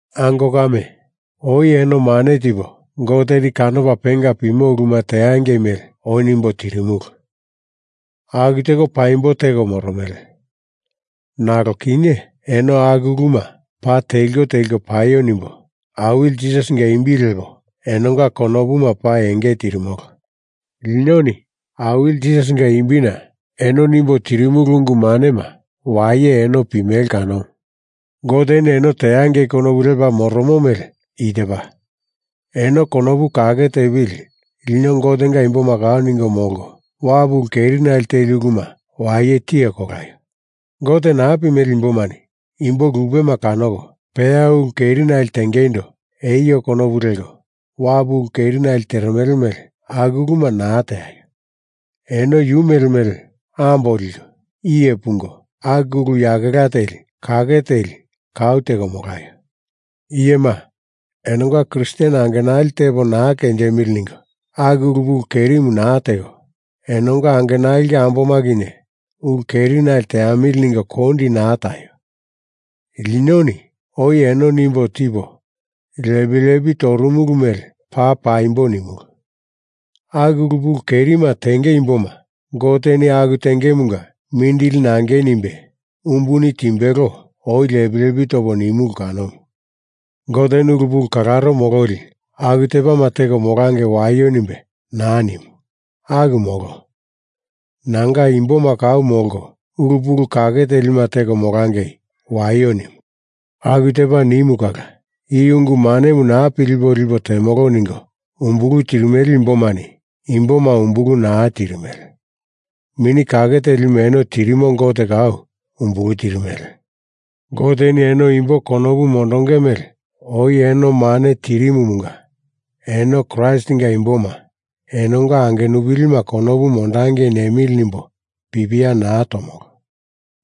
Ango kame, oi eno mane tipo Goteni kanopa penga pimo uluma teangei mele oi nimbo tirimulu. Aku teko paimbo teko moromele. Nalo kinye eno aku uluma paa teliko teliko paio nimbo Awili Jisasinga imbi lepo enonga konopuma paa enge tirimolo. Linoni Awili Jisasinga imbina eno nimbo tirimulu ungu manema waye eno pimele kanomu. Goteni eno teangei konopu lepa moromo mele i tepa: Eno konopu kake tepili lino Gotenga imboma kau ningo molko, wapu ulu kerinali teli uluma waye tiye kolaio. Gote naa pimele imbomani imbo lupema kanoko peya ulu kerinali tengeindo eio konopu leko wapu ulu kerinali teremele mele aku uluma naa teaio. Eno yu mele mele ambo liko iye pungo aku ulu yakela teli kake teli kau teko molaio. Iyema, enonga Kristen angenali tepo naa kenjimili ningo aku ulu pulu kerimu naa teko, enonga angenalinga amboma kinye ulu kerinali teamili ningo kondi naa taio. Linoni oi eno nimbo tipo lepi lepi torumulu mele paa paimbo nimulu. Aku ulu pulu kerima tenge imboma Goteni aku tengemunga mindili nangei nimbe umbuni timbelo oi lepi lepi topo nimulu kanomu. Goteni ulu pulu kalaro mololi aku tepama teko molangei waio nimbe naa nimu. Aku molo. Nanga imboma kau molko ulu pulu kake telima teko molangei waio nimu. Aku tepa nimu kala i ungu manemu naa pilipo lipo temolo ningo umbulu tirimele imbomani imboma umbulu naa tirimele. Mini Kake Telimu eno tirimo Gote kau umbulu tirimele. Goteni eno imbo konopu mondonge mele oi eno mane tirimumunga eno Kraistinga imboma enonga angenupilima konopu mondangei nemili nimbo pipia naa tomolo.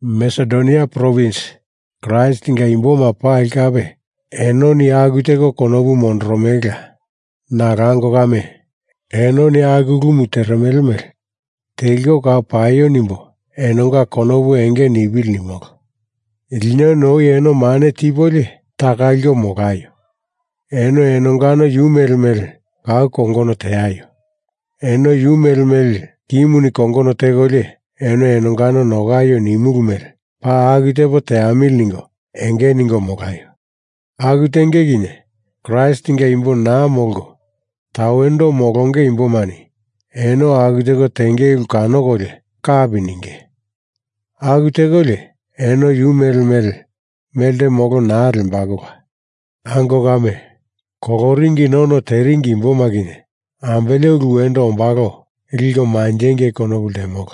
Masedonia provins Kraistinga imboma pali kape enoni aku teko konopu mondoromelela. Nalo ango kame, enoni aku ulumu teremele mele teliko kau paio nimbo enonga konopu enge nipili nimolo. Linoni oi eno mane tipolio taka liko molaio! Eno enongano yu mele mele kau kongono teaio! Eno yu mele mele kimuni kongono tekolio eno enongano nokaio nimulu mele paa aku tepo teamili ningo enge ningo molaio! Aku tenge kinye Kraistinga imbo naa molko tawendo molonge imbomani eno aku teko tenge ulu kanokolio kapi ninge. Aku tekolio eno yu mele mele melte molo naa lembalola. Ango kame, koloringina ono teringi imboma kinye ambele ulu wendo ombalo liko manjengei konopu ltemolo.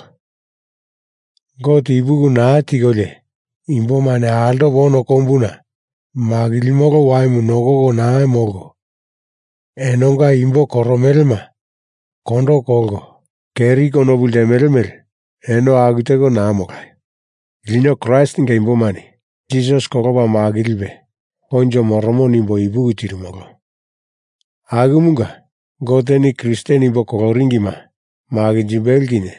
Gote ipuki naa tikolio imbomani altopo ono kombuna makilimolo waimu nokoko naa molko enonga imbo koromelema kondo kolko keri konopu ltemele mele eno aku teko naa molaio. Lino Kraistinga imbomani Jisas kolopa makilipe koinjo moromo nimbo ipuki tirimolo. Akumunga Goteni Kristen imbo koloringima makinjimbelo kinye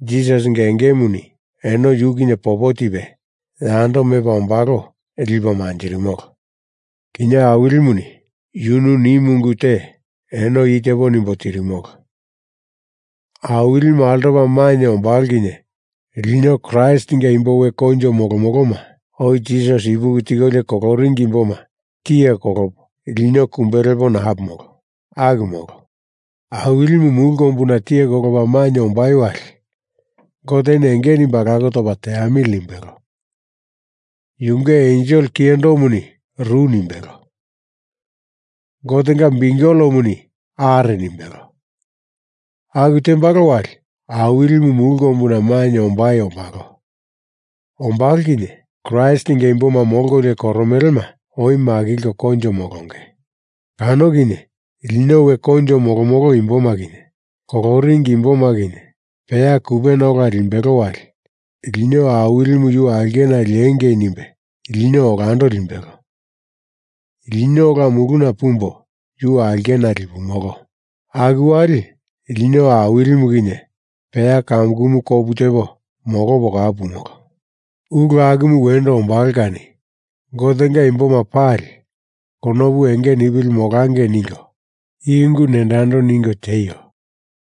Jisasinga engemuni eno yu kinye popo tipe yando mepa ombalo lipo manjirimolo. Kinye Awilimuni yunu nimu ungu te eno i tepo nimbo tirimolo, Awilimu altopa mainye ombalo kinye lino Kraistinga imbo we koinjo molomoloma oi Jisas ipuki tikolio koloringi imboma tiye kolopo lino kumbe lepo naa pumolo. Aku molo. Awilimu mulu kombuna tiye kolopa mainye ombai wali Goteni enge nimbe alako topa teamili nimbelo. Yunge ensel kiyendomuni ru nimbelo. Gotenga biukelemuni are nimbelo. Aku tembalo wali Awilimu mulu kombuna mainye ombai ombalo. Ombalo kinye Kraistinga imboma molkolio koromelema oi makilko koinjo molonge. Kano kinye lino we koinjo molomolo imboma kinye koloringi imboma kinye peya kupena ola limbelo wali, lino Awilimu yu aulkena liengei nimbe lino olando limbelo, lino ola muluna pumbo yu aulkena lipumolo. Aku wali lino Awilimu kinye peya kamukumu kopu tepo molopo kau pumolo. Ulu akumu wendo ombalo kani Gotenga imboma pali konopu enge nipili molangei ningo i ungu nendo yando ningo tieio.